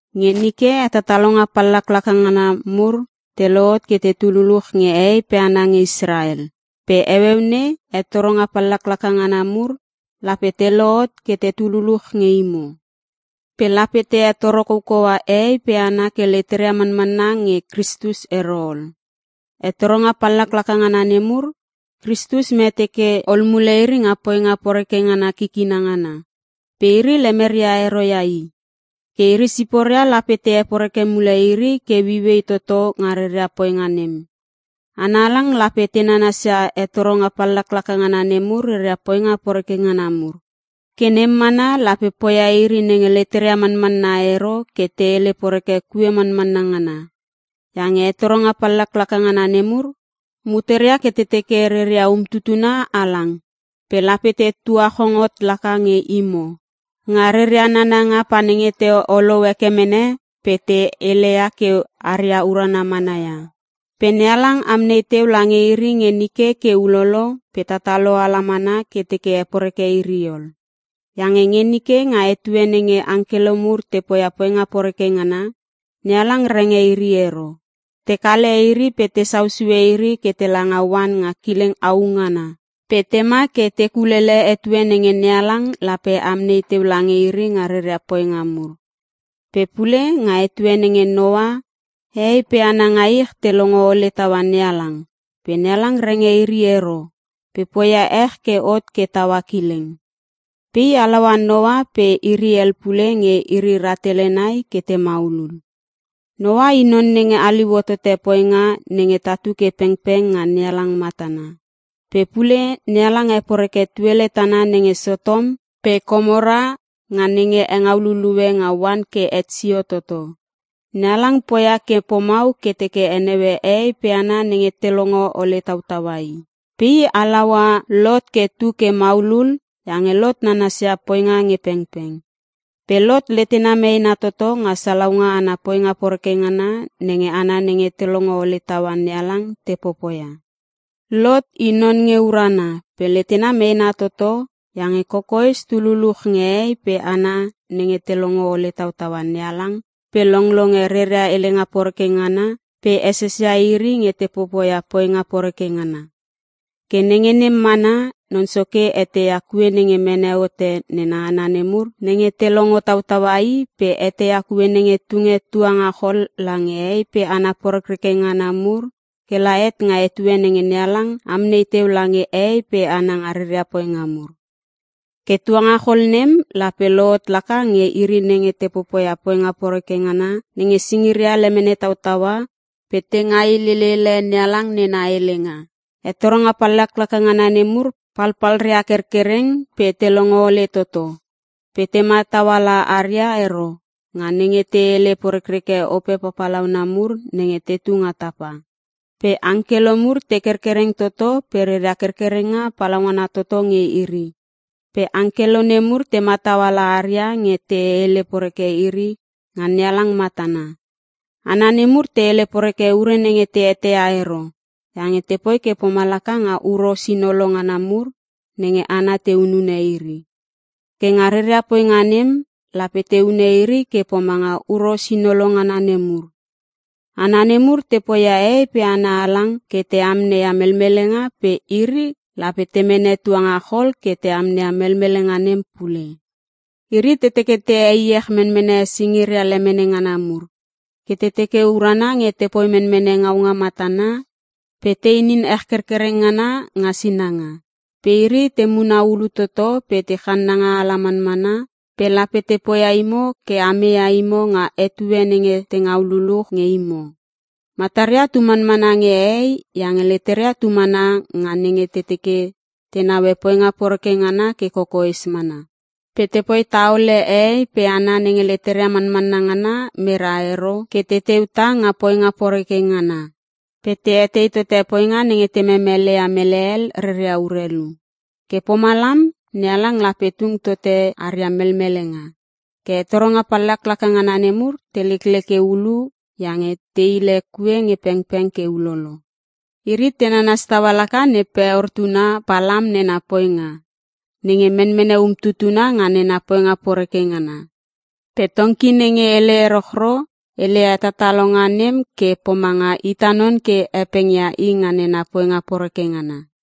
Nge nike hetatalonga pallaklaka ngana mur te lohot ke tetu luluch nge hehei pe hana nge Israel, pe heueu nei hetoronga pallaklaka ngana mur lape te lohot ke tetu luluch nge imo. Pe lape te hetoro koukoua hehei pe hana ke leteria manmanna nge Kristus ero ol. Hetoronga pallaklaka ngana nemur, Kristus mete ke ol mule iri nga poinga poreke ngana kikina ngana, pe iri lemeria ero ia I. Ke iri siporia lape te heporeke mule iri ke ueiuei toto nga reria poinga nem. Hana halang lape te nanasia hetoronga pallaklaka ngana nemur reria poinga poreke ngana mur. Ke nem mana lape poia iri nenge leteria manmanna ero ke te hele poreke kue manmanna ngana. Iange hetoronga pallaklaka ngana nemur, muteria ke te teke reria umtutuna halang pe lape te tuachong hot laka nge imo, nga reria nananga pa nenge te olou heke mene pe te heleia ke haria urana mana ia. Pe NeHalang amnei teu lange iri nge nike ke ulolo pe tatalo ala mana ke teke heporeke iri ol. Iange nge nike nga etue nenge angkelo mur te poia poinga poreke ngana, NeHalang renge iri ero. Te kale iri pe tesau sue iri ke tela nga oan nga kileng au ngana pe tema ke te kulele etue nenge NeHalang lape amnei teu lange iri nga reria poinga mur. Pe pule nga etue nenge Noa, hehei pe hana nga ich te longo ole taua NeHalang pe NeHalang renge iri ero pe poia ech ke hot ke taua kileng. Pe I halaua Noa pe iri hel pule nge iri rahtele nai ke te maulul. Noa i non nenge haliu hotote poinga nenge tatu ke pengpeng nga NeHalang matana. Pe pule NeHalang heporeke tuele tana nenge Sotom pe Komora nga nenge hengau lulue nga oan ke het sio toto. NeHalang poia ke pomau ke teke heneue hehei pe hana nenge te longo ole tautaua i. Pe I halaua Lot ke tu ke maulul iange Lot nanasia poinga nge pengpeng. Pe Lot letena meena toto nga salaunga ana poinga poreke ngana nenge hana nenge te longo ole taua NeHalang te popoia. (Lot i non nge urana pe letena meena toto iange kokoes tu luluch nge hehei pe hana nenge te longo ole tautaua NeHalang pe longlonge reria helenga poreke ngana pe esesia iri nge te popoia poinga poreke ngana.) Ke nenge nem manmanna, Non Soke eteia kue nenge mene hote nena hana nemur nenge te longo tautaua i pe eteia kue nenge tunge tuangachol lange hehei pe hana porekreke ngana mur ke la het nga etue nenge NeHalang amnei teu lange hehei pe hana nga reria poinga mur. Ke tuangachol nem lape lohot laka nge iri nenge te popoia poinga poreke ngana nenge singiria lemene tautaua pe te ngailelele NeHalang nena helenga. Hetoronga pallaklaka ngana nemur palpalria kerkereng, pe te longo ole toto, pe te matau ala aria ero nga nenge te hele porekreke ope papalauna mur nenge tetu nga tapa. Pe angkelo mur te kerkereng toto pe reria kerkerenga palaungana toto nge iri, pe angkelo nemur te matau ala aria nge te hele poreke iri nga NeHalang matana. Hana nemur te hele poreke ure nenge te eteia ero iange tepoi ke pomalaka nga huros inolo ngana mur nenge hana te hunune iri. Ke nga reria poinga nem, lape te hune iri ke pomanga huros inolo ngana nemur. Hana nemur te poia hehei pe hana halang ke te amneia melmelenga pe iri lape te mene tuangachol ke te amneia melmelenga nem pule. Iri te teke te heiech menmene singiria lemene ngana mur, ke te teke urana nge te poi menmene ngaunga matana, pe te inin ech kerkereng ngana nga sinanga. Pe iri te muna ulu toto pe te channanga ala manmana pe lape te poia imo ke a meia imo nga etue nenge te ngau luluch nge imo. Mataria tu manmana nge hehei iange leteria tu mana nga nenge te teke te naue poinga poreke ngana ke kokoes mana. Pe tepoi taole hehei pe hana nenge leteria manmanna ngana mera ero ke teteu tah nga poinga poreke ngana, pe te etei tote poinga nenge te memeleia mele hel reria urelu. Ke pomalam NeHalang lape tung tote aria melmelenga! Ke hetoronga pallaklaka ngana nemur te lekleke ulu iange te hile kue nge pengpeng ke ulolo. Iri te nanas taua laka ne Peor tuna Palam nena poinga, nenge menmene umtutuna nga nena poinga poreke ngana. Pe tongki nenge hele erochro, heleia hetatalonga nem ke pomanga ita non ke hepengia i nga nena poinga poreke ngana.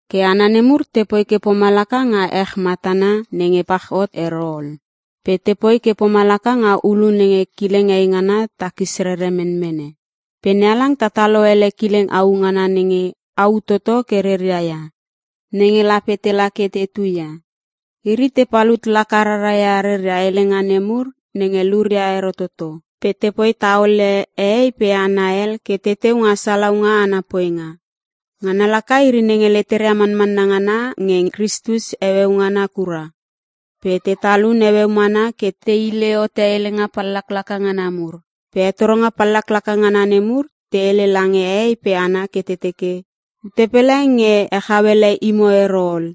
Ke hana nemur tepoi ke pomalaka nga ech matana nenge pach hot ero ol, pe tepoi ke pomalaka nga ulu nenge kileng eingana takis rere menmene. Pe NeHalang tatalo ele kileng au ngana nenge au toto ke reria ia nenge lape tela ke tetu ia. Iri te palut laka rara ia reria helenga nemur nenge luria ero toto pe tepoi taole hehei pe hana hel ke teteu nga salaunga ana poinga. (Ngana laka iri nenge leteria manmanna ngana nge Kristus heueu ngana kura pe te talun heueu mana ke te hile hote helenga pallaklaka ngana mur.) Pe hetoronga pallaklaka ngana nemur te hele lange hehei pe hana ke te teke, “Ute pele nge hechau ele imo ero ol,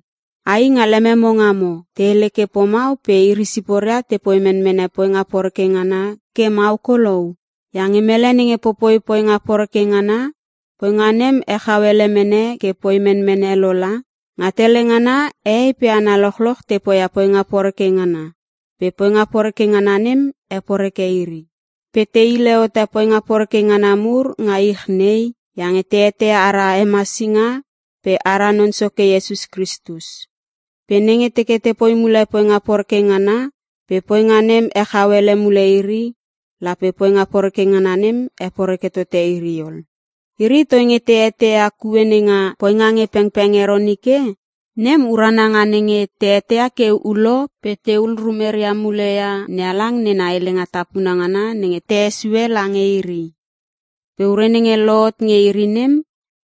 ai nga lememo ngamo.” Te hele ke pomau pe iri siporia tepoi menmene poinga poreke ngana ke mau kolou. Iange mele nenge poipoi poinga poreke ngana, poinga nem hechau ele mene ke poi menmene lo la. Nga tele ngana hehei pe hana lochloch te poia poinga poreke ngana pe poinga poreke ngana nem heporeke iri. Pe te hile hote poinga poreke ngana mur nga ich nei iange te eteia ara Hemasinga pe ara Non Soke Iesus Kristus. Pe nenge teke tepoi mule poinga poreke ngana pe poinga nem hechau ele mule iri, lape poinga poreke ngana nem heporeke tote iri ol. Iri toinge te eteia kue nenga poinga nge pengpeng ero nike. Nem urana nga nenge te eteia ke ulo pe tehul rumeria mule ia NeHalang nena helenga tapuna ngana nenge te hesue lange iri. Pe ure nenge lohot nge iri nem,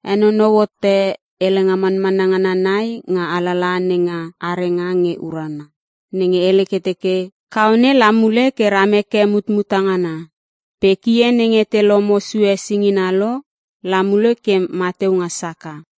henonou hote helenga manmanna ngana nai nga alalaha nenga Arenga Nge Urana (Provep) nenge hele ke teke, “Kaone la mule ke ram heke mutmuta ngana” pe “Kie nenge te lomo sue singina lo, la mule ke mateu nga saka.”